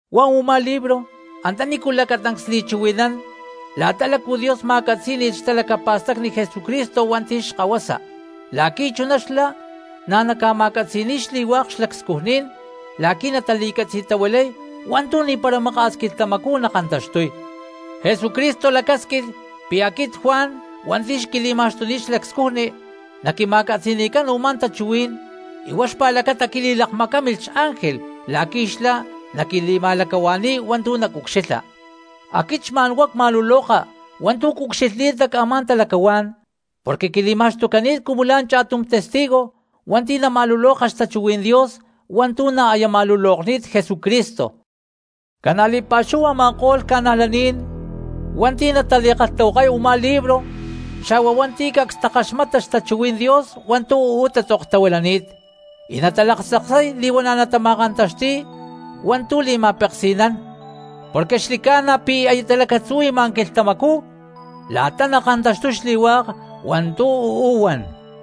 Huá u̠má libro antanícu lacatancs li̠chuhui̠nán la̠ta lácu Dios ma̠catzí̠ni̠lh xtalacapa̠stacni Jesúcristo hua̠nti̠ xKahuasa, la̠qui̠ chuná xlá na̠ naca̠ma̠catzi̠ni̠y xli̠hua̠k xlacscujní̠n la̠qui̠ natali̠catzi̠tahuilay hua̠ntu̠ ni̠para maka̠s quilhtamacú nakantaxtuy. Jesucristo lacásquilh pi̠ aquit Juan hua̠nti̠ xlá quili̠ma̠xtuni̠t xlacscujni, naquima̠catzi̠ni̠cán u̠má tachuhuí̠n y huá xpa̠lacata quilakmacámilh xángel la̠qui̠ xlá naquili̠ma̠lacahua̠ni̠y hua̠ntu̠ nacucxilha. Aquit xma̠n huá cma̠luloka hua̠ntu̠ cucxilhni̠t nac a̠má talacahuá̠n, porque quili̠ma̠xtucani̠t cumu la̠ cha̠tum testigo hua̠nti̠ nama̠luloka xtachuhuí̠n Dios hua̠ntu̠ na̠ aya ma̠lulokni̠t Jesucristo. Ca̠na li̠pa̠xúhu a̠ma̠ko̠lh cristianos hua̠nti̠ natali̠kalhtahuakay u̠má libro, xa̠hua hua̠nti̠ cacs takaxmata xtachuhuí̠n Dios hua̠ntu̠ uú tatzoktahuilani̠t, y natalaktzaksay li̠huana̠ natama̠kantaxti̠y hua̠ntu̠ li̠ma̠peksi̠nán, porque xli̠ca̠na pi̠ aya talacatzuhui̠ma quilhtamacú la̠ta nakantaxtuy xli̠hua̠k hua̠ntu̠ uú huan.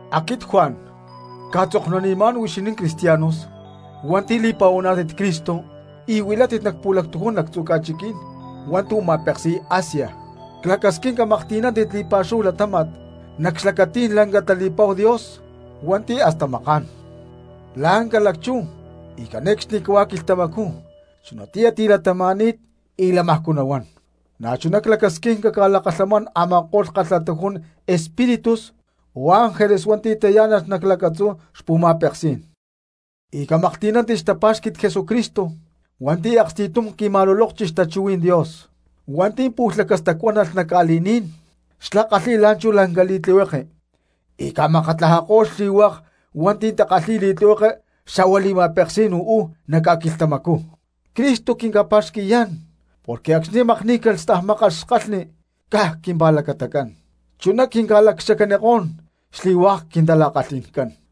Aquit Juan cca̠tzoknunimá̠n huixinín cristianos hua̠nti̠ li̠pa̠huaná̠tit Cristo y huilátit nac pu̠lactujún lactzu̠ ca̠chiquí̠n hua̠ntu̠ ma̠peksi̠y Asia. Clacasquín camaklhti̠nántit li̠pa̠xúhu latáma̠t nac xlacatí̠n lanca tali̠pa̠hu Dios hua̠nti̠ hasta maká̠n, la̠ ca̠lacchú y cane̠cxnicahuá quilhtamacú chunatiyá tilatama̠ni̠t y lamajcú nahuán, na̠chuná clacasquín caca̠lakalhamán a̠ma̠ko̠lh kalhatujún espíritus o ángeles hua̠nti̠ tayá̠nalh nac lacatzú xpu̠ma̠peksí̠n, y camaklhti̠nántit xtapá̠xqui̠t Jesucristo hua̠nti̠ aksti̠tum qui̠ma̠lulókchi xtachuhuí̠n Dios, hua̠nti̠ pu̠lh lacastacuánalh nac ca̠li̠ní̠n, xlá kalhi̠y la̠nchú lanca li̠tlihueke y ca̠makatlajako̠y xli̠hua̠k hua̠nti̠ takalhi̠y li̠tlihueke xa̠hua li̠ma̠peksí̠n uú nac ca̠quilhtamacú. Cristo quinca̠pa̠xqui̠yá̠n porque acxni̠ makní̠calh y stajmákalh xkalhni caj quimpa̠lacatacán, chuná quinca̠lacxacanikó̠n xli̠hua̠k quintala̠kalhi̠ncán.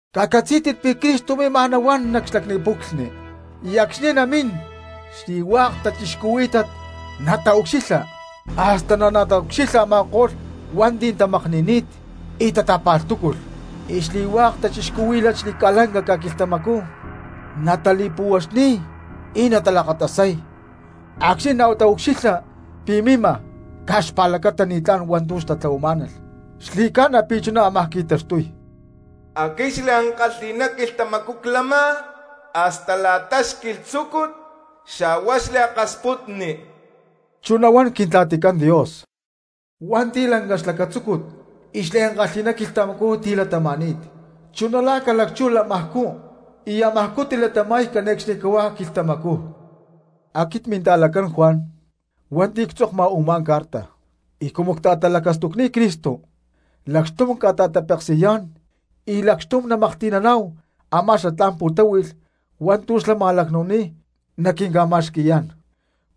¡Cacatzí̠tit pi̠ Cristo mímaj nahuán nac xlacni puclhni! Y acxni̠ namín xli̠hua̠k cristianos nataucxilha, hasta na̠ nataucxilha a̠ma̠ko̠lh hua̠nti̠ tamakni̠ni̠t y tata̠pa̠lhtúculh; y xli̠hua̠k cristianos xalac xli̠ca̠lanca ca̠quilhtamacú natali̠puhuaxni̠y y natalaktasay acxni̠ nataucxilha pi̠ mima caj xpa̠lacata ni̠tlán hua̠ntu̠ xtatlahuamá̠nalh. Xli̠ca̠na pi̠ chuná ámaj qui̠taxtuy. “Aquit xliankalhi̠ná quilhtamacú clama, hasta la̠ta xquilhtzúcut, xa̠hua xliakasputni.” Chuná huán Quimpu̠chinacán Dios hua̠nti̠ lanca xlacatzúcut y xliankalhi̠ná quilhtamacú tilatama̠ni̠t, chuná la̠ ca̠lacchú lamajcú y amajcú tilatama̠y cane̠cxnicahuá quilhtamacú. Aquit minta̠lacán Juan hua̠nti̠ ctzokma u̠má carta, y cumu cta̠talacastucni̠t Cristo lacxtum cca̠ta̠tapeksi̠yá̠n y lacxtum namaklhti̠naná̠hu a̠má xatlá̠n xpu̠tahui̠lh hua̠ntu̠ xlá ma̠lacnu̠ni̠t naquinca̠ma̠xqui̠yá̠n,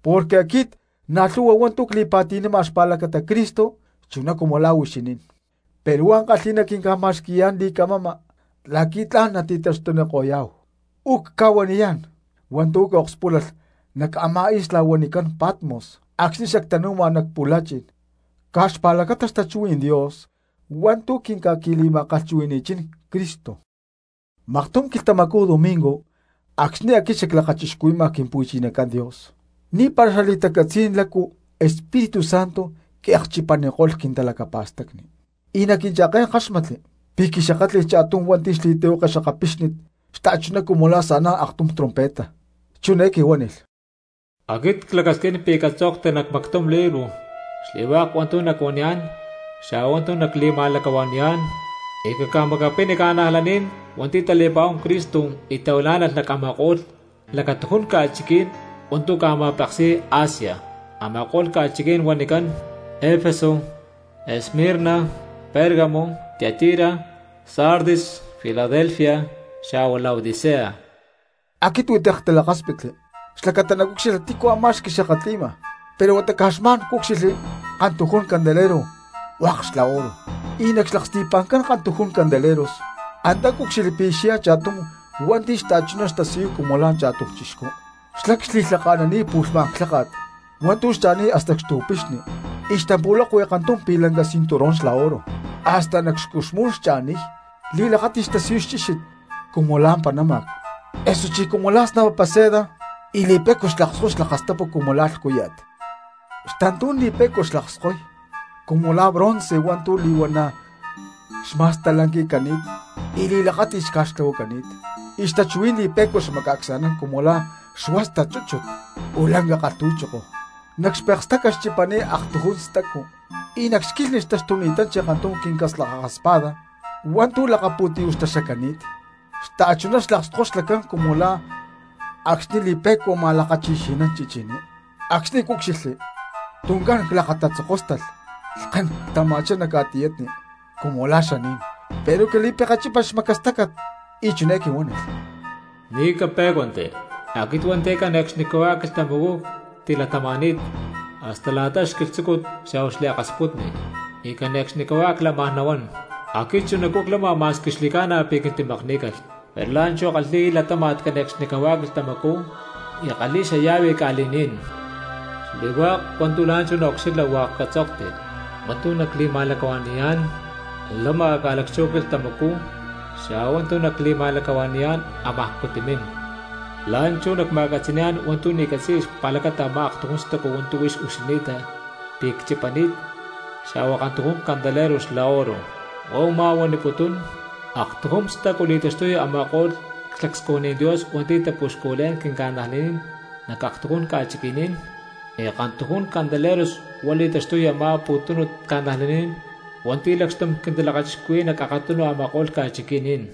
porque aquit na̠ lhu̠hua hua̠ntu̠ cli̠pa̠ti̠nama xpa̠lacata Cristo chuná cumu la̠ huixinín, pero huá ankalhi̠ná quinca̠ma̠xqui̠yá̠n li̠camama la̠qui̠ tla̠n nati̠taxtuniko̠yá̠hu. Ucca̠huaniyá̠n hua̠ntu̠ cakspúlalh nac a̠má isla huanicán Patmos acxni̠ xactanu̠ma nac pu̠la̠chi̠n caj xpa̠lacata xtachuhuí̠n Dios hua̠ntu̠ quinca̠qui̠li̠ma̠kalhchuhui̠ni̠chín Cristo. Maktum quilhtamacú domingo acxni̠ aquit xaclakachixcuhui̠ma Quimpu̠chinacán, ni̠para xali̠tacatzí̠n lácu Espíritu Santo quiakchipaniko̠lh quintalacapa̠stacni, y nac quincha̠ké̠n ckáxmatli pi̠ quixakátli̠lh cha̠tum hua̠nti̠ xli̠tlihueke xakapixni xta̠chuná cumu la̠ sa̠nán aktum trompeta chiné quihuánilh: —Aquit clacasquín pi̠ catzokti nac mactum libro xli̠hua̠k hua̠ntu̠ nacuaniyá̠n xa̠hua hua̠ntu̠ nacli̠ma̠lacahua̠ni̠yá̠n, y caca̠macapini cristianos hua̠nti̠ tali̠pa̠huán Cristo y tahuilá̠nalh nac a̠ma̠ko̠lh lacatujún ca̠chiqui̠ní̠n hua̠ntu̠ ca̠ma̠peksi̠y Asia, a̠ma̠ko̠lh ca̠chiqui̠ní̠n huanicán: Efeso, Esmirna, Pérgamo, Tiatira, Sardis, Filadelfia xa̠hua Laodicea. Aquit huitek ctalakáspitli xlacata nacucxilha tícu a̠má xquixakatli̠ma; pero huata caj xma̠n cúcxilhli kantujún candeleros hua̠k xla oro, y nac xlaksti̠pa̠ncán kantujún candeleros antá cúcxilhli pi̠ xyá cha̠tum hua̠nti̠ xta̠chuná xtasiyuy cumu la̠ cha̠tum chixcú, xlá xli̠lhaka̠nani̠t pu̠lhmá̠n clháka̠t hua̠ntu̠ xcha̠niy hasta xtu̠pixni, y xtampu̠lakui kantum pi̠lanca cinturón xla oro, hasta nac xcuxmú̠n xcha̠niy. Li̠lakáti̠t xtasiyuy xchíxit cumu la̠ panáma̠c osuchí la̠ snapapa seda, y li̠pe̠cua xlakskoy xlakastapu cumu la̠ lhcúya̠t. Xtantú̠n li̠pe̠cua xlakskoy cumu la̠ bronce hua̠ntu̠ li̠huana̠ xma̠stalanqui̠cani̠t y li̠lakáti̠t xca̠xtlahuacani̠t; y xtachuhuí̠n li̠pe̠cua xmacaacsa̠nán cumu la̠ xuástat aktum chúchut, o lanca kalhtu̠choko. Nac xpekestácat xchipani̠t aktujún stacu, y nac xquilhni xtaxtuni̠tanchi aktum quincaslajaja espada hua̠ntu̠ lakapu̠tiyú̠ xtaxacani̠t. Xta̠chuná xlakskoy xlacán cumu la̠ acxni̠ li̠pe̠cua ma̠lakachixi̠nán chichiní. Acxni̠ cúcxilhli tuncán clakatatzokóstalh, lhkén ctama̠chá nac ca̠tiyatni cumu la̠ xaní̠n. Pero quili̠pekechípalh xmacastácat y chiné quihuánilh: —Ni̠ capé̠cuanti, aquit hua̠nti̠ cane̠cxnicahuá quilhtamacú ctilatama̠ni̠t, hasta la̠ta xquilhtzúcut, xa̠hua xliakasputni, y cane̠cxnicahuá clamaj nahuán. Aquit chunacú clama ma̠squi xli̠ca̠na pi̠ quintimakní̠calh, pero la̠nchú ckalhi̠y latáma̠t cane̠cxnicahuá quilhtamacú y ckalhi̠y xallave ca̠li̠ní̠n. Xli̠hua̠k hua̠ntu̠ la̠nchú naucxilha hua̠k catzokti, sampi nacli̠ma̠lacahua̠ni̠yá̠n lama ca̠lacchú quilhtamacú xa̠hua hua̠ntu̠ nacli̠ma̠lacahua̠ni̠yá̠n amajcú timín. La̠nchú nacma̠catzi̠ni̠yá̠n hua̠ntu̠ ni̠ catzi̠ya xpa̠lacata amá aktujún stacu hua̠ntu̠ huix ucxilhni̠ta pi̠ cchipani̠t xa̠hua kantujún candelero xla oro, huá u̠má huaniputún: aktujún stacu li̠taxtuy a̠ma̠ko̠lh xlacscujní̠n Dios hua̠nti̠ tapuxculé̠n quinca̠najlaní̠n nac aktujún ca̠chiqui̠ní̠n, y kantujún candeleros huá li̠taxtuy a̠má pu̠tunu cristianos hua̠nti̠ lacxtum quintalakachixcuhui̠y nac akatunu a̠ma̠ko̠lh ca̠chiqui̠ní̠n.